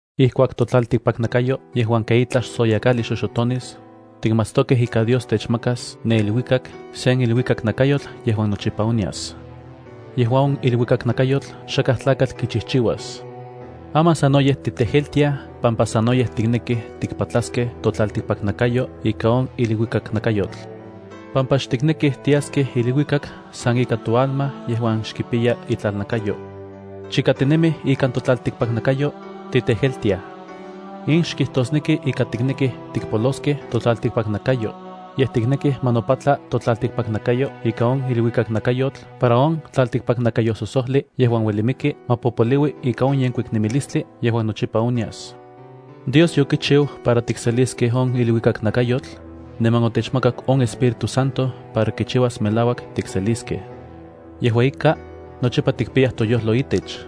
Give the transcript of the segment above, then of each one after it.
Ijkuak totlaltikpaknakayo yejuan ken itlaj soyakajli xoxotonis, tikmatstokej ika Dios techmakas ne iluikak sen iluikaknakayotl yejuan nochipa onyas. Yejua on iluikaknakayotl xakaj tlakatl kichijchiuas. Aman sanoyej titejeltiaj pampa sanoyej tiknekij tikpatlaskej totlaltikpaknakayo ika on iluikaknakayotl pampa xtiknekij tiaskej iluikak san ika toalma yejuan xkipiya itlalnakayo. Chika tinemij ikan totlaltikpaknakayo, titejeltiaj. In xkijtosneki ika tiknekij tikpoloskej totlaltikpaknakayo, yej tiknekij ma nopatla totlaltikpaknakayo ika on iluikaknakayotl para on tlaltikpaknakayososojli yejuan ueli miki ma popoliui ika on yenkuik nemilistli yejuan nochipa onyas. Dios yokichiu para tikseliskej on iluikaknakayotl, niman otechmakak on Espíritu Santo para kichiuas melauak tikseliskej. Yejua ika, nochipa tikpiyaj toyojlo itech.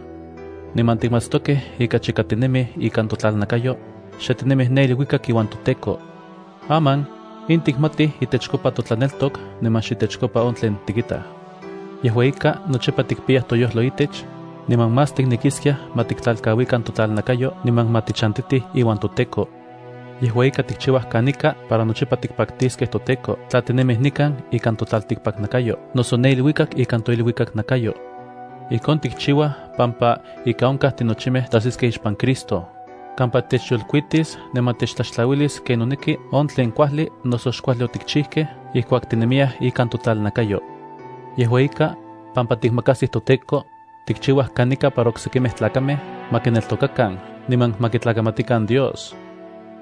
Niman tikmatstokej ika chika tinemij ikan totlalnakayo, xe tinemij ne iluikak iuan toTEKO. Aman, in tikmatij itechkopa totlaneltok niman xitechkopa on tlen tikitaj. Yejua ika, nochipa tikpiyaj toyojlo itech, niman más tiknekiskiaj ma tiktlalkauikan totlalnakayo niman ma tichantitij iuan toTEKO. Yejua ika tikchiuaj kanika para nochipa tikpaktiskej toTEKO tla tinemij nikan ikan totlaltikpaknakayo noso ne iluikak ikan toiluikaknakayo. Ijkon tikchiuaj pampa, ika onkaj tinochimej tajsiskej ixpan Cristo, kampa techyolkuitis niman techtlaxtlauilis ken noneki on tlen kuajli noso xkuajli otikchijkej ijkuak tinemiyaj ikan totlalnakayo. Yejua ika, pampa tikmakajsij toTEKO, tikchiuaj kanika para oksekimej tlakamej ma kineltokakan niman ma kitlakamatikan Dios.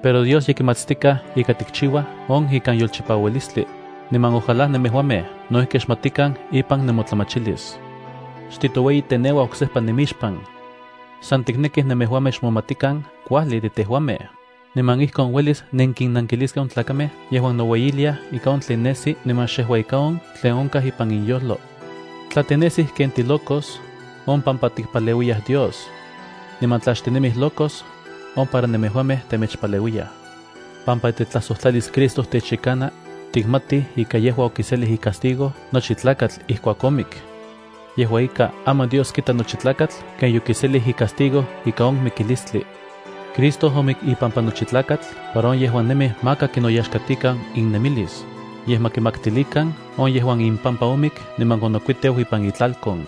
Pero Dios ye kimatstikaj ika tikchiuaj on ikan yolchipaualistli, niman ojalá nemejuamej no ijki xmatikan ipan nemotlamachilis. Xtitoueyiteneuaj oksejpa nemixpan. San tiknekij nemejuamej xmomatikan kuajli de tejuamej, niman ijkon uelis nenkinnankiliskej on tlakamej yejuan noueyiliaj ika on tlen nesi niman xejua ika on tlen onkaj ipan inyojlo. Tla tinesij ken tilocos, on pampa tikpaleuiyaj Dios. Niman tla xtinemij locos, on para nemejuamej temechpaleuiyaj. Pampa itetlajsojtlalis Cristo techyekana, tikmatij ika yejua okiselij icastigo nochi tlakatl ijkuak omik. Yejua ika, aman Dios kita nochi tlakatl ken yokiselij icastigo ika on mikilistli. Cristo omik ipampa nochi tlakatl para on yejuan nemij maka kinoyaxkatikan innemilis, yej ma kimaktilikan on yejuan impampa omik niman onokuiteu ipan itlalkon.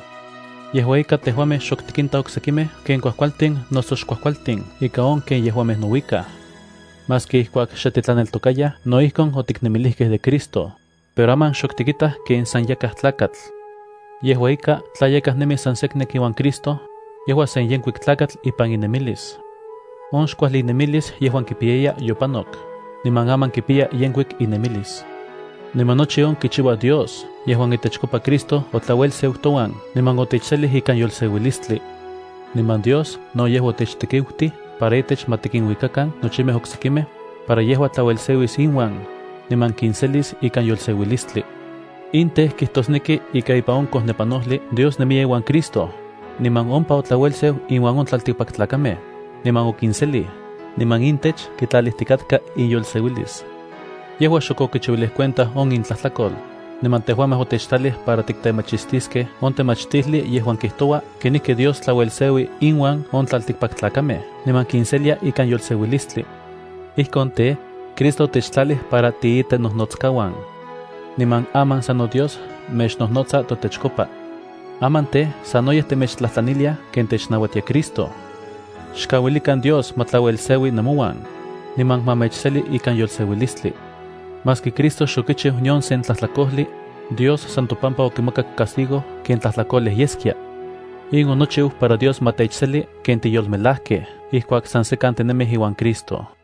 Yejua ika, tejuamej xok tikintaj oksekimej ken kuajkualtin noso xkuajkualtin ika on ken yejuamej nouikaj. Maski ijkuak xe titlaneltokayaj no ijkon otiknemilijkej de Cristo, pero aman xok tikitaj ken san yakaj tlakatl. Yejua ika, tla yakaj nemi san seknek iuan Cristo, yejua sen yenkuik tlakatl ipan inemilis. On xkuajli inemilis yejuan kipiyaya yopanok, niman aman kipiya yenkuik inemilis. Niman nochi on kichiua Dios yejuan itechkopa Cristo otlauelseu touan niman otechselij ikan yolseuilistli. Niman Dios no yejua otechtekiutij para itech ma tikinuikakan nochimej oksekimej, para yejua tlauelseuis inuan, niman kinselis ikan yolseuilistli. In tej, kijtosneki ika ipan on kojnepanojli Dios nemiya iuan Cristo, niman ompa otlauelseu inuan on tlaltikpaktlakamej, niman okinselij, niman intech kitlalijtikatka iyolseuilis. Yejua xok okichiuilij cuenta on intlajtlakol. Niman tejuamej otechtlalij para tiktemachistiskej on temachtijli yejuan kijtoua kenijki Dios tlauelseui inuan on tlaltikpaktlakamej niman kinselia ikan yolseuilistli. Ijkon tej, Cristo otechtlalij para tiitenojnotskauan. Niman aman sano Dios mechnojnotsa totechkopa. Aman tej, sanoyej temechtlajtlaniliaj ken technauatia Cristo: xkauilikan Dios ma tlauelseui nemouan, niman ma mechseli ikan yolseuilistli. Maski Cristo xokichiu nion se tlajtlakojli, Dios san topampa okimakak castigo ken tlajtlakolej yeskia. In onochiu para Dios ma techseli ken tiyolmelajkej ijkuak san sekan tinemij iuan Cristo.